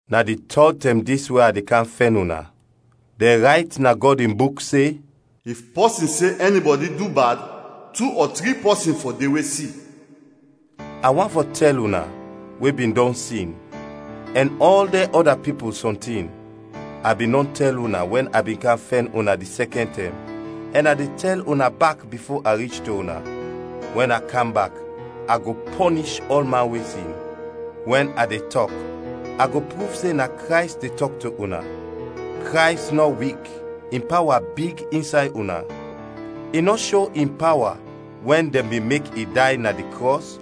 Na di tɔd tɛm dis we a de kam fɛn una. Dɛn rayt na Gɔd in Buk se, “If pɔsin se ɛnibɔdi du bad, tu ɔ tri pɔsin fɔ de we si.” A want fɔ tɛl una, we bin dɔn sin, ɛn ɔl dɛn ɔda pipul, sɔntin; a bin dɔn tɛl una wɛn a bin kam fɛn una di sɛkɛn tɛm, ɛn a de tɛl una bak bifo a rich to una: wɛn a kam bak a go pɔnish ɔlman we sin. Wɛn a de tɔk, a go pruv se na Krays de tɔk to una. Krays nɔ wik, in pawa big insay una. I nɔ sho in pawa wɛn dɛn bin mek i day na di krɔs,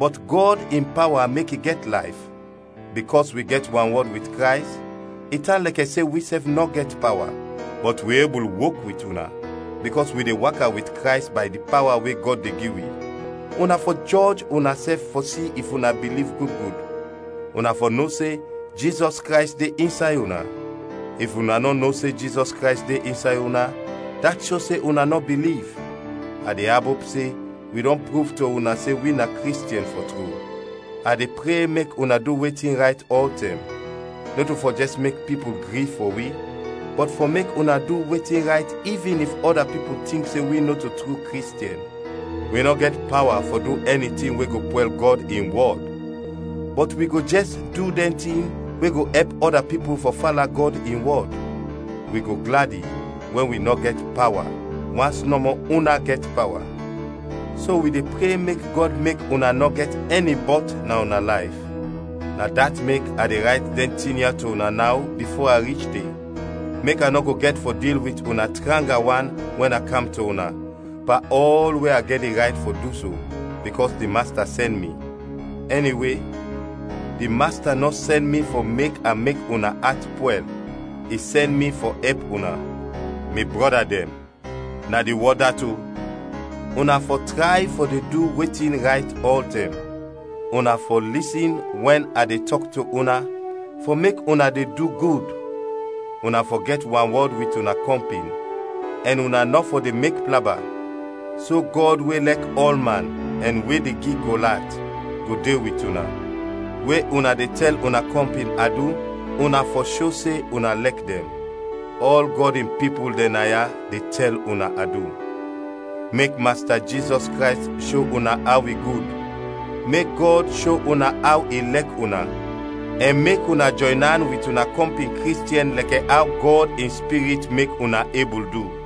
bɔt Gɔd in pawa mek i gɛt layf. Bikɔs wi gɛt wanwɔd wit Krays, i tan lɛkɛ se wisɛf nɔ gɛt pawa, bɔt wi ebul wok wit una, bikɔs wi de waka wit Krays bay di pawa we Gɔd de gi wi. Una fɔ jɔj unasɛf fɔ si if una biliv gud gud. Una fɔ no se Jizɔs Krays de insay una. If una nɔ no se Jizɔs Krays de insay una, dat sho se una nɔ biliv. A de abop se wi dɔn pruv to una se wi na Kristiɛn, fɔ tru. A de pre mek una du wetin rayt ɔltɛm: nɔto fɔ jɛs mek pipul gri fɔ wi, bɔt fɔ mek una du wetin rayt ivin if ɔda pipul tink se wi nɔto tru Kristiɛn. Wi nɔ gɛt pawa fɔ du ɛni tin we go pwɛl Gɔd in wɔd, bɔt wi go jɛs du dɛn tin we go ɛp ɔda pipul fɔ fala Gɔd in wɔd. Wi go gladi wɛn wi nɔ gɛt pawa, wans nɔmɔ una gɛt pawa. So wi de pre mek Gɔd mek una nɔ gɛt ɛni bɔt na una layf. Na dat mek a de rayt dɛn tin ya to una naw bifo a rich de; mek a nɔ go gɛt fɔ dil wit una tranga wan wɛn a kam to una, pan ɔl we a gɛt di rayt fɔ du so, bikɔs di Masta sɛn mi; ɛniwe, di Masta nɔ sɛn mi fɔ mek a mek una at pwɛl, i sɛn mi fɔ ɛp una. Mi brɔda dɛn, na di wɔd dat o! Una fɔ tray fɔ de du wetin rayt ɔltɛm; una fɔ lisin wɛn a de tɔk to una fɔ mek una de du gud, una fɔ gɛt wanwɔd wit una kɔmpin, ɛn una nɔ fɔ de mek plaba. So Gɔd we lɛk ɔlman ɛn we de gi kol at go de wit una. We una de tɛl una kɔmpin adu, una fɔ sho se una lɛk dɛn. Ɔl Gɔd in pipul dɛn naya de tɛl una adu. Mek Masta Jizɔs Krays sho una aw i gud, mek Gɔd sho una aw i lɛk una, ɛn mek una jɔyn an wit una kɔmpin Kristiɛn lɛkɛ aw Gɔd in Spirit mek una ebul du.